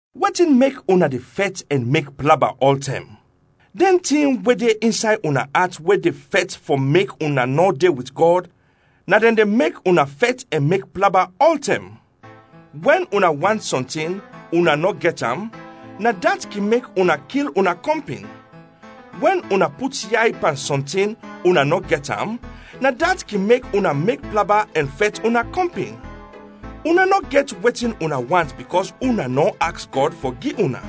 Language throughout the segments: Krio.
Wetin mek una de fɛt ɛn mek plaba ɔltɛm? Dɛn tin we de insay una at we de fɛt fɔ mek una nɔ de wit Gɔd, na dɛn de mek una fɛt ɛn mek plaba ɔltɛm. Wɛn una want sɔntin una nɔ gɛt am, na dat kin mek una kil una kɔmpin. Wɛn una put yay pan sɔntin una nɔ gɛt am, na dat kin mek una mek plaba ɛn fɛt una kɔmpin. Una nɔ gɛt wetin una want bikɔs una nɔ aks Gɔd fɔ gi una.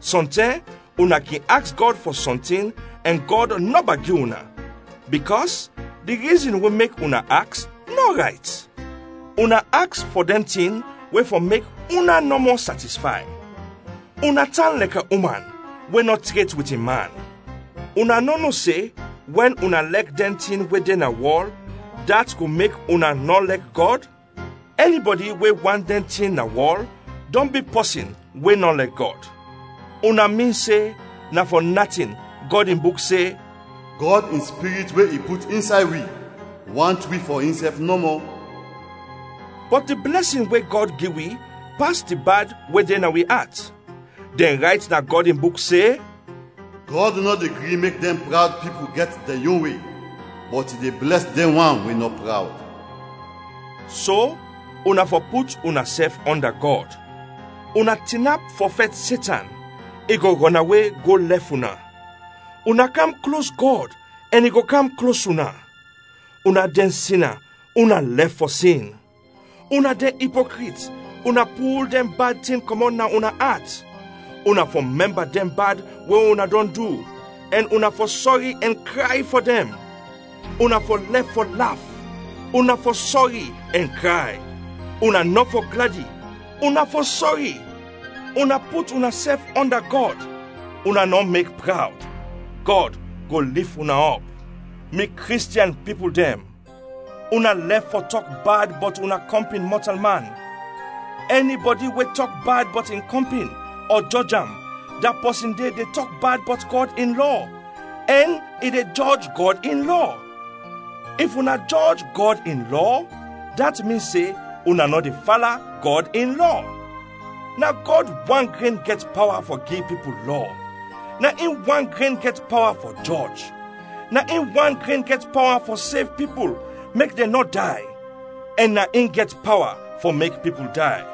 Sɔntɛm una kin aks Gɔd fɔ sɔntin ɛn Gɔd nɔba gi una, bikɔs di rizin we mek una aks nɔ rayt. Una aks fɔ dɛn tin we fɔ mek una nɔmɔ satisfay. Una tan lɛkɛ uman we nɔ tret wit in man! Una nɔ no se wɛn una lɛk dɛn tin we de na wɔl, dat go mek una nɔ lɛk Gɔd? Ɛnibɔdi we want dɛn tin na wɔl dɔn bi pɔsin we nɔ lɛk Gɔd. Una min se na fɔ natin Gɔd in Buk se, “Gɔd in Spirit we i put insay wi, want wi fɔ insɛf nɔmɔ?” Bɔt di blɛsin we Gɔd gi wi pas di bad we de na wi at. Dɛn rayt na Gɔd in Buk se, “Gɔd nɔ de gri mek dɛn prawd pipul gɛt dɛn yon we, bɔt i de blɛs dɛn wan we nɔ prawd.” So, una fɔ put unasɛf ɔnda Gɔd. Una tinap fɔ fɛt Setan, i go rɔnawe go lɛf una. Una kam klos Gɔd ɛn i go kam klos una. Una dɛn sina, una lɛf fɔ sin. Una dɛn ipokrit, una pul dɛn bad tin kɔmɔt na una at. Una fɔ mɛmba dɛn bad we una dɔn du; ɛn una fɔ sɔri ɛn kray fɔ dɛn. Una fɔ lɛf fɔ laf, una fɔ sɔri ɛn kray; una nɔ fɔ gladi, una fɔ sɔri. Una put unasɛf ɔnda Gɔd, una nɔ mek prawd, Gɔd go lif una ɔp. Mi Kristiɛn pipul dɛn, una lɛf fɔ tɔk bad bɔt una kɔmpin mɔtalman. Ɛnibɔdi we tɔk bad bɔt in kɔmpin ɔ jɔj am, da pɔsin de de tɔk bad bɔt Gɔd in Lɔ, ɛn i de jɔj Gɔd in Lɔ. If una jɔj Gɔd in Lɔ, dat min se una nɔ de fala Gɔd in Lɔ. Na Gɔd wan gren gɛt pawa fɔ gi pipul Lɔ, na in wan gren gɛt pawa fɔ jɔj, na in wan gren gɛt pawa fɔ sev pipul mek dɛn nɔ day, ɛn na in gɛt pawa fɔ mek pipul day.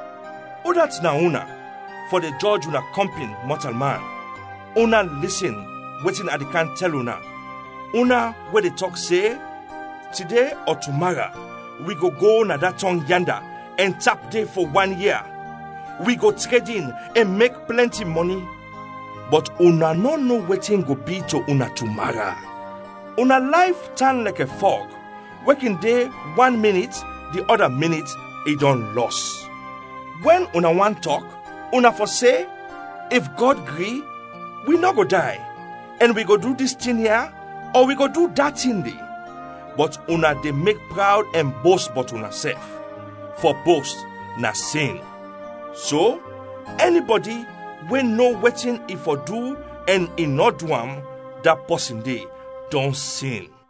Udat na una fɔ de jɔj una kɔmpin mɔtalman? Una lisin wetin a de kam tɛl una, una we de tɔk se, “Tide ɔ tumara wi go go na da tɔng yanda ɛn tap de fɔ wan ia. Wi go tredin, ɛn mek plɛnti mɔni.” Bɔt una nɔ no wetin go bi to una tumara. Una layf tan lɛkɛ fɔg we kin de wan minit, di ɔda minit i dɔn lɔs. Wɛn una want tɔk, una fɔ se, “If Gɔd gri, wi nɔ go day ɛn wi go du dis tin ya ɔ wi go du da tin de.” Bɔt una de mek prawd ɛn bost bɔt unasɛf. Fɔ bost na sin. So, ɛnibɔdi we no wetin i fɔ du ɛn i nɔ du am, da pɔsin de dɔn sin.